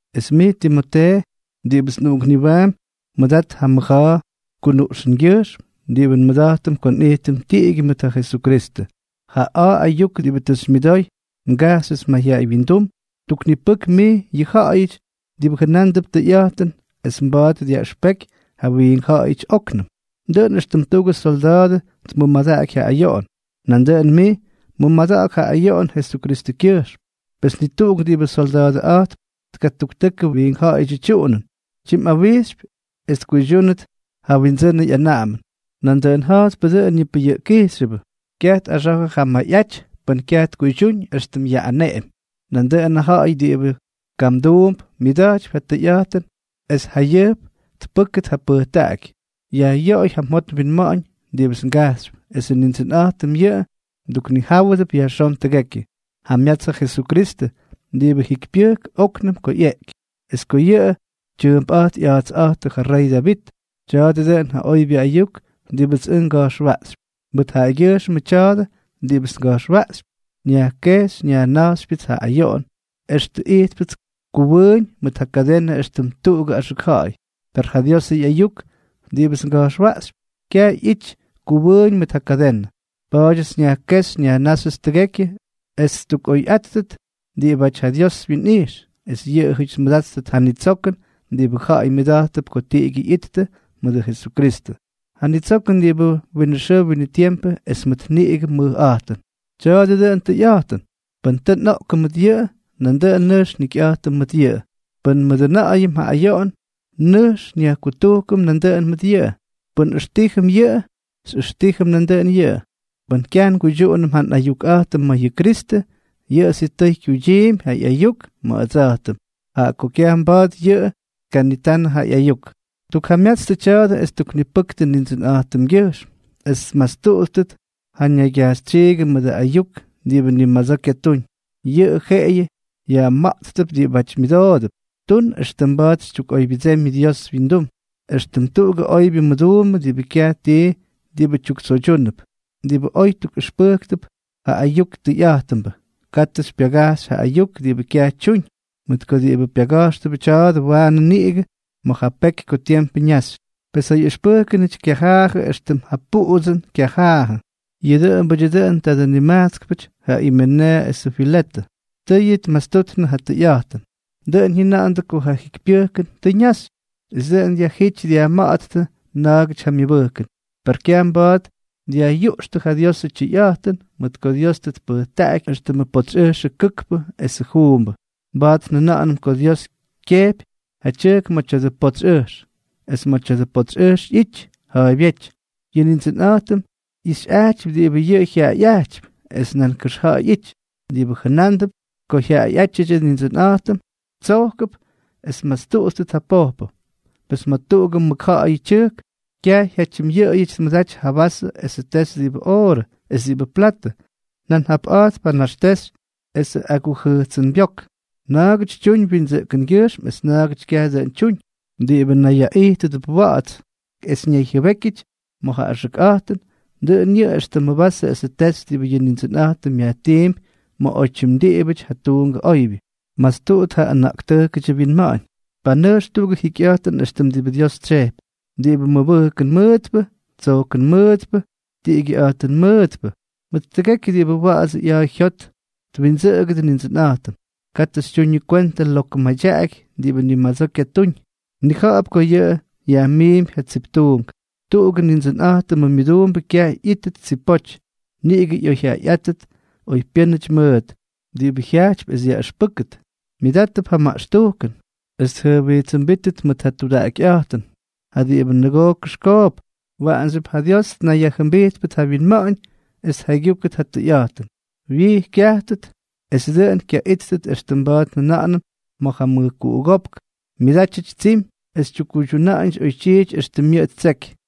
Es mij Timotee, diꞌibʉts nꞌuꞌunkniwaampy, mʉdat ja mʉja̱a̱ kunuꞌxʉngyʉjxm diꞌibʉ nmʉda̱jtʉm ko nꞌijtʉm tiꞌigyʉ mʉt ja Jesukristʉ. Ja a̱a̱ ayuk diꞌibʉ tʉ xymyʉdoy ngajxyʉts mayjyaꞌay windum, tuknipʉk mij yʉ ja̱ꞌa̱yʉty diꞌibʉ jʉna̱a̱mp tʉyꞌa̱jtʉn es mba̱a̱t dyaꞌʉxpeky ja wiink ja̱ꞌa̱yʉty óknʉm. Dʉꞌʉn éxtʉm tuꞌugʉ solda̱a̱dʉ tmʉmadaꞌaky ja ayoꞌon, nandʉꞌʉn mij mʉmada̱ꞌa̱k ja ayoꞌon Jesukristʉkyʉjxm. Pes ni tuꞌuk diꞌibʉ solda̱a̱dʉꞌa̱jtp tkatuktʉkʉ wiink ja̱ꞌa̱yʉdyʉ tyuꞌunʉn, tyimꞌawijxypy es tkuydyúnʉt ja wyindsʉnʉ ꞌyanaꞌamʉn. Nandʉꞌʉn ja̱jtpʉ dʉꞌʉn yʉ pʉyʉꞌkkijxyʉbʉ, kyaj tꞌaxa̱jʉ ja myayꞌaty pʉn kyaj tkuydyúñ éxtʉm yaꞌꞌaneꞌemy. Nandʉꞌʉn ja ja̱ꞌa̱y diꞌibʉ kamduump myʉda̱jtypy ja tʉyꞌa̱jtʉn es jayʉjp tpʉ́kʉt ja pʉjtaꞌaky. Yajꞌyoꞌoy ja mjot mwinma̱ꞌa̱ñ diꞌibʉts ngajxypy, esʉ Nindsʉnꞌa̱jtʉm yʉꞌʉ mduknijáwʉdʉp yajxón tʉgekyʉ. Jamyats ja Jesukristʉ, diꞌibʉ jikypyʉjk óknʉm ko ꞌyeꞌky, es ko yʉꞌʉ tyʉʉmpꞌa̱jt ꞌya̱a̱tsꞌa̱jtʉ ja rey Davit. Tya̱a̱dʉ dʉꞌʉn ja oybyʉ ayuk diꞌibʉts ʉj nga̱jxwaꞌxypy. Mʉt yʉꞌʉgyʉjxmʉ tya̱a̱dʉ diꞌibʉts nga̱jxwaꞌxypy, nyajkejxy nyajna̱jxypyʉts ja ayoꞌon, extʉ ijtpʉts kʉwʉʉñ mʉt ja kadenʉ éxtʉm tuꞌugʉ axʉk ja̱ꞌa̱y. Per ja Diosʉ ꞌyayuk diꞌibʉts nga̱jxwaꞌxypy, kyaj ꞌyity kʉwʉʉñ mʉt ja kadenʉ. Pa̱a̱dyʉts nyajkéxy nyajnáxyʉts tʉgekyʉ es ttukꞌoyꞌáttʉt diꞌibáty ja Dios wyinꞌijx, es yʉꞌʉjʉty tmʉdáttʉt ja nitsokʉn diꞌibʉ ja̱ꞌa̱y myʉda̱jttʉp ko tiꞌigyʉ ꞌyittʉ mʉdʉ Jesukristʉ, ja nitsokʉn diꞌibʉ winʉ xʉʉ winʉ tiempʉ es mʉt niꞌigʉ mʉjꞌa̱jtʉn. Tya̱a̱dʉ dʉꞌʉn tʉyꞌa̱jtʉn: Pʉn tʉ nꞌoꞌkʉm mʉt yʉꞌʉ, nandʉꞌʉn nʉjx njikyꞌa̱jtʉm mʉt yʉꞌʉ. Pʉn nmʉdʉna̱ꞌa̱yʉm ja ayoꞌon, nʉjx nyajkutujkʉm nandʉꞌʉn mʉt yʉꞌʉ. Pʉn nꞌʉxtíjʉm yʉꞌʉ, xyꞌʉxtíjʉm nandʉꞌʉn yʉꞌʉ. Pʉn kyaj nguydyuꞌunʉm ja nꞌayukꞌa̱jtʉm ma̱ yʉ Kristʉ, yʉꞌʉ sitʉy kyuydyiimpy ja ꞌyayuk ma̱ ʉdsa̱jtʉm, jaꞌa ko kyaj mba̱a̱t yʉꞌʉ tkanitanʉ ja ꞌyayuk. Tukjamyatstʉ tya̱a̱dʉ es tuknipʉktʉ Nindsʉnꞌa̱jtʉmgyʉjxm, es tmastuꞌuttʉt ja naygyajxytsyiigʉ mʉdʉ ayuk diꞌibʉ ni madsoo kyatúñ. Yʉꞌʉ jeꞌeyʉ yajma̱ꞌttʉp diꞌibáty myʉdoodʉp. Tun extʉ mba̱a̱t xytyukꞌoybyʉdsemy Dios windum, éxtʉm tuꞌugʉ oybyʉ mʉduumbʉ diꞌibʉ kyaj tii diꞌibʉ tyuktsoydyúnʉp, diꞌibʉ oy tukꞌʉxpʉjkp ja ayuk tʉyꞌa̱jtʉnbʉ. Katʉ xypyagajxy yʉ ayuk diꞌibʉ kyaj tyuñ, mʉt ko diꞌibʉ pyaga̱jxtʉp kya̱ꞌa̱dʉ waanʉ niꞌigʉ ma̱ ja peky ko tiempʉ ñaxy. Pes ja ꞌyʉxpʉjkʉnʉty kyajaajʉ éxtʉm ja puꞌutsʉn kyajaajʉ. Yʉꞌʉ dʉꞌʉmbʉdyʉ dʉꞌʉn tadʉ nimajtskpʉty ja Imeneeʉ esʉ Filetʉ. Tʉ yʉꞌʉ tmastuꞌuttʉ ja tʉyꞌa̱jtʉn. Dʉꞌʉn jyʉna̱ꞌa̱ndʉ ko ja jikypyʉjkʉn tʉ ñaxy, es dʉꞌʉn dyajjít dyajma̱ꞌa̱ttʉ na̱a̱gʉty ja myʉbʉjkʉn. Per kyaj mba̱a̱t dyajꞌyuꞌxtʉ ja Diosʉ tyʉyꞌa̱jtʉn, mʉt ko Dios tʉ tpʉjtaꞌaky éxtʉmʉ potsy ʉjxʉ kʉkpʉ esʉ juumbʉ. Mba̱a̱t njʉna̱ꞌa̱nʉm ko Dios kyejpy ja tyʉjk ma̱ tya̱dʉ potsy ʉjx, es ma̱ tya̱dʉ potsy ʉjx ꞌyity ja̱a̱ybyéty: “Yʉ Nindsʉnꞌa̱jtʉm ꞌyixyꞌajtypy diꞌibʉ yʉꞌʉ jyaꞌaꞌa̱jtypy.” Es nan kʉxja̱ꞌa̱y ꞌyity: “Diꞌibʉ jʉnándʉp ko jyaꞌaꞌátyʉdyʉ Nindsʉnꞌa̱jtʉm, tsojkʉp es tmastuꞌutʉt ja pojpʉ.” Pes ma̱ tuꞌugʉ mʉkja̱ꞌa̱yʉ tyʉjk, kyaj jyatyimꞌyʉꞌʉyʉty tmʉdaty ja vasʉ esʉ texy diꞌibʉ oorʉ es diꞌibʉ platʉ, nan japꞌa̱jtp ja naxtexy esʉ agujʉjtsʉnbyók; na̱a̱gʉty tyuñ windsʉꞌkʉngyʉjxm es na̱a̱gʉty kyaj dʉꞌʉn tyuñ. Diꞌibʉ nayyaꞌijtʉdʉp wa̱ꞌa̱ts es ñayjyʉbékyʉty ma̱ ja axʉkꞌa̱jtʉn, dʉꞌʉn yʉꞌʉ éxtʉmʉ vasʉ esʉ texy diꞌibʉ yʉ Nindsʉnꞌa̱jtʉm yajtiimpy ma̱ oytyim diꞌibʉty ja tuungʉ oybyʉ. Mastuꞌut ja ʉna̱ꞌktʉjkʉdyʉ wyinma̱ꞌa̱ñ. Panʉjx tuꞌugʉ jikyꞌa̱jtʉn éxtʉm diꞌibʉ Dios tsyejpy, diꞌibʉ mʉbʉjkʉn mʉʉtpʉ, tsojkʉn mʉʉtpʉ, tiꞌigyʉꞌa̱jtʉn mʉʉtpʉ, mʉt tʉgekyʉ diꞌibʉ wa̱ꞌa̱dsʉ ꞌya̱a̱ jyot twindsʉꞌʉgʉdʉ Nindsʉnꞌa̱jtʉm. Katʉ xytyuñʉ kwentʉ lokʉ madyaꞌaky diꞌibʉ ni madsoo kyatúñ. Mnija̱ꞌa̱p ko yʉꞌʉ yajmiimpy ja tsiptuunk. Tuꞌugʉ Nindsʉnꞌa̱jtʉmʉ myʉduumbʉ kyaj ꞌyítʉt tsipoty; niꞌigʉ ꞌyoyjyaꞌayꞌátʉt oypyʉ́nʉty mʉʉt, diꞌibʉ jyajtypy es yaꞌʉxpʉ́kʉt, myʉdátʉp ja maꞌxtujkʉn es tjʉjwijtsʉmbítʉt mʉt ja tudaꞌakyꞌa̱jtʉn ja diꞌibʉ nʉgoo kʉxkoop, waꞌanxyʉp ja Dios tnayyajjʉmbijtpʉt ja wyinma̱ꞌa̱ñ es tjaygyúkʉt ja tʉyꞌa̱jtʉn, wyij kyajtʉt, es dʉꞌʉn kyaꞌíttʉt éxtʉm mba̱a̱t njʉna̱ꞌa̱nʉm ma̱ ja mʉjkuꞌugópk myʉdátyʉty tsimy es tyuktuna̱ꞌa̱ñʉty oytyiity éxtʉm yʉꞌʉ ttseky.